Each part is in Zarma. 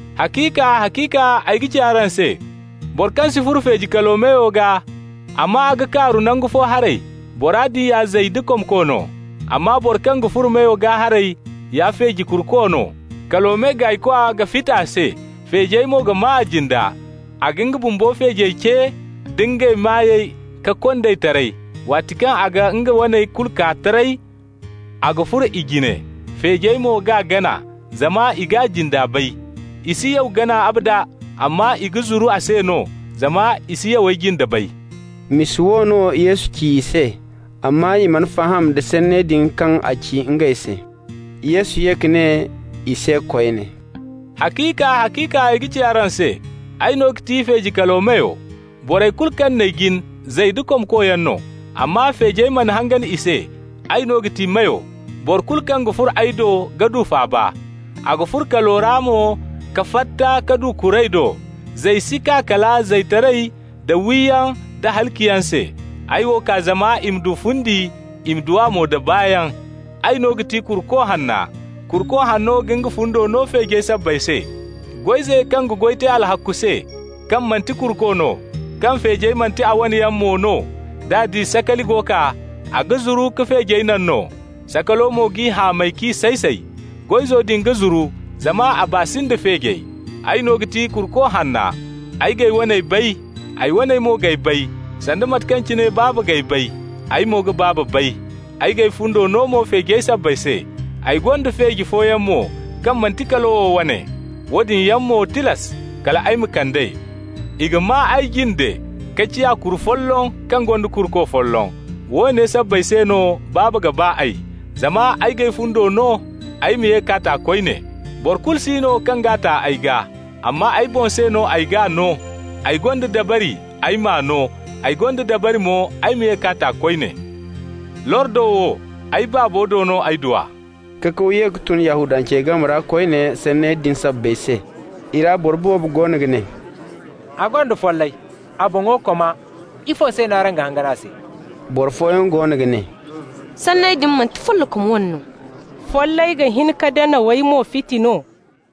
«Haciika, haciika ay ga ci araŋ se: boro kaŋ si furo feeji kalo meyo gaa, amma a ga kaaru nangu fo haray, bora din ya zay da komko no. Amma boro kaŋ ga furo meyo gaa haray ya feeji kuruko no. Kalo me gaaykwa ga fiti a se, feejey mo ga maa a jinde. A ga nga bumbo feejey ce nda ngey maayey ka kond'ey taray. Waati kaŋ a ga nga waney kulu kaa taray, a ga furo i jine. Feejey mo g'a gana, zama i g'a jinda bay. I si yaw gana abada, amma i ga zuru a se no, zama i si yawey jinde bay.» Misa wo no Yesu ci i se, amma i mana faham da sanney din kaŋ a ci ngey se. Yesu ye ka ne i se koyne: «Haciika, haciika ay ga ci araŋ se: ay no ga ti feeji kalo meyo. Borey kulu kaŋ n'ay jin, zay da komko yaŋ no, amma feejey mana hangan i se. Ay no ga ti meyo. Boro kulu kaŋ ga furo ay do ga du faaba. A ga furo kalo ra mo ka fatta ka du kuray do. Zay si kaa kala zaytaray da wiyaŋ da halaciyaŋ se. Ay wo kaa zama i ma du fundi, i ma du a mo da baayaŋ. Ay no ga ti kuruko hanna. Kuruko hanno ga nga fundo no feejey sabbay se. Goy-ize kaŋ ga goy te alhakku se, kaŋ manti kuruko no, kaŋ feejey manti a wane yaŋ mo no, d'a di sakali go kaa, a ga zuru ka feejey naŋ no. Sakalo mo g'i hamay k'i say-say. Goy-izo din ga zuru zama a baa si nda feejey. Ay no ga ti kuruko hanna. Ay g'ay waney bay, ay waney mo g'ay bay sanda mate kaŋ cine Baaba g'ay bay, ay mo ga Baaba bay. Ay g'ay fundo no mo feejey sabbay se. Ay gonda feeji fooyaŋ mo kaŋ manti kalo wo wane. Woodin yaŋ mo tilas kal ay ma kand'ey. I ga maa ay jinde ka ciya kuru folloŋ kaŋ gonda kuruko folloŋ. Woone sabbay se no Baaba ga ba ay: zama ay g'ay fundo no, ay ma ye k'a ta koyne. Boro kulu si no kaŋ g'a ta ay gaa, amma ay boŋ se no ay g'a no. Ay gonda dabari ay m'a no, ay gonda dabari mo ay ma ye k'a ta koyne. Lordo wo, ay Baabo do no ay du a.» Kakaw ye ka tun Yahudancey game ra koyne sanney din sabbay se. I ra boro boobo goono ga ne: «A gonda follay, a boŋo koma! Ifo se no araŋ ga hangan a se?» Boro fooyaŋ goono ga ne: «Sanney din manti follokom wane no. Follay ga hin ka danawey moy fiti no?»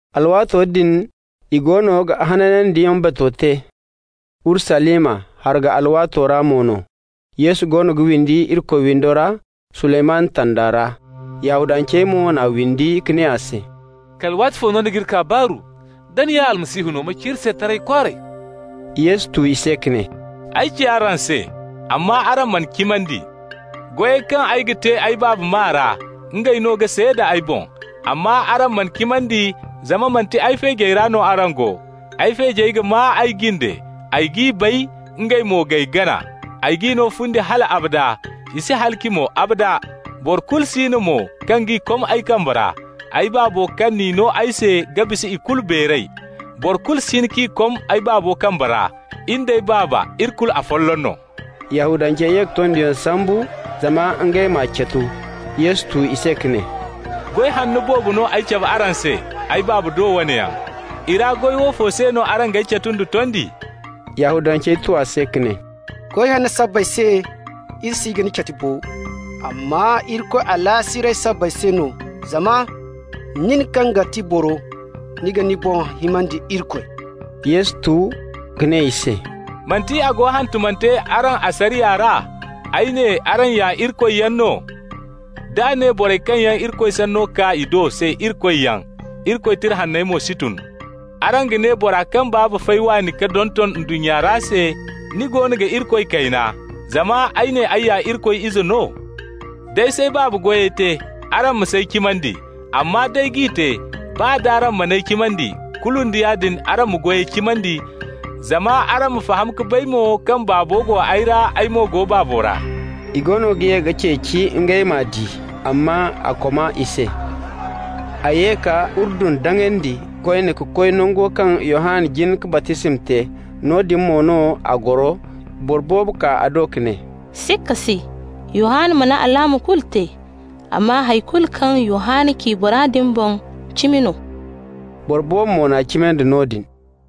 Alwaato din i goono ga Hanandiyaŋ Bato te Urusalima, hargu alwaato ra mo no. Yesu goono ga windi Irikoy windo ra Suleymanu tanda ra. Yahudancey mo n'a windi ka ne a se: «Kala waatifo no ni g'iri kaa baaru? Da ni ya Almasihu no, ma ci iri se taray kwaaray.» Yesu tu i se ka ne: «Ay ci araŋ se, amma araŋ mana cimandi. Goyey kaŋ yaŋ ay ga te ay Baaba maa ra, ngey no ga seeda ay boŋ. Amma araŋ mana cimandi zama manti ay feejey ra no araŋ go. Ay feejey ga maa ay jinde, ay g'i bay, ngey mo g'ay gana. Ay g'i no fundi hal abada, i si halaci mo, abada. Boro kulu si no mo kaŋ g'i kom ay kambe ra. Ay Baabo kaŋ n'i no ay se ga bisa ikulu beeray. Boro kulu si hin k'i kom ay Baabo kambe ra. In d'ay Baaba, iri kulu afolloŋ no.» Yahudancey ye ka tondiyaŋ sambu zama ngey m'a catu. Yesu tu i se ka ne: «Goy hanno boobo no ay cabe araŋ se, ay Baaba do wane yaŋ. I ra goy woofo se no araŋ g'ay catu nda tondi?» Yahudancey tu a se ka ne: «Goy hanno sabbay se iri si ga ni catu bo, amma Irikoy alaasiray sabbay se no, zama nin kaŋ ga ti boro, ni ga ni boŋ himandi Irikoy.» Yesu tu ka ne i se: «Manti a go hantumante araŋ asariya ra: ‹Ay ne: Araŋ ya irikoyyaŋ no?› D'a ne borey kaŋ yaŋ Irikoy sanno kaa i do se ‹irikoyyaŋ› (Irikoy Tira Hanney mo si tun), araŋ ga ne bora kaŋ Baaba fay waani ka donton ndunnya ra se: ni goono ga Irikoy kayna, zama ay ne ay ya Irikoy Izo no? D'ay s'ay Baaba goyey te, araŋ ma s'ay cimandi. Amma d'ay g'i te, baa d'araŋ man'ay cimandi, kulu nda yaadin araŋ ma goyey cimandi, zama araŋ ma faham ka bay mo kaŋ Baabo go ay ra, ay mo go Baabo ra.» I goono ga ye ka ceeci ngey m'a di, amma a koma i se. A ye ka Urdun daŋandi koyne ka koy nango kaŋ Yohanna jin ka baptisma te, noodin mo no a goro. Boro boobo kaa a do ka ne: «Sikka si, Yohanna mana alaama kulu te, amma hay kulu kaŋ Yohanna ci bora din boŋ, cimi no.» Boro boobo mo n'a cimandi noodin.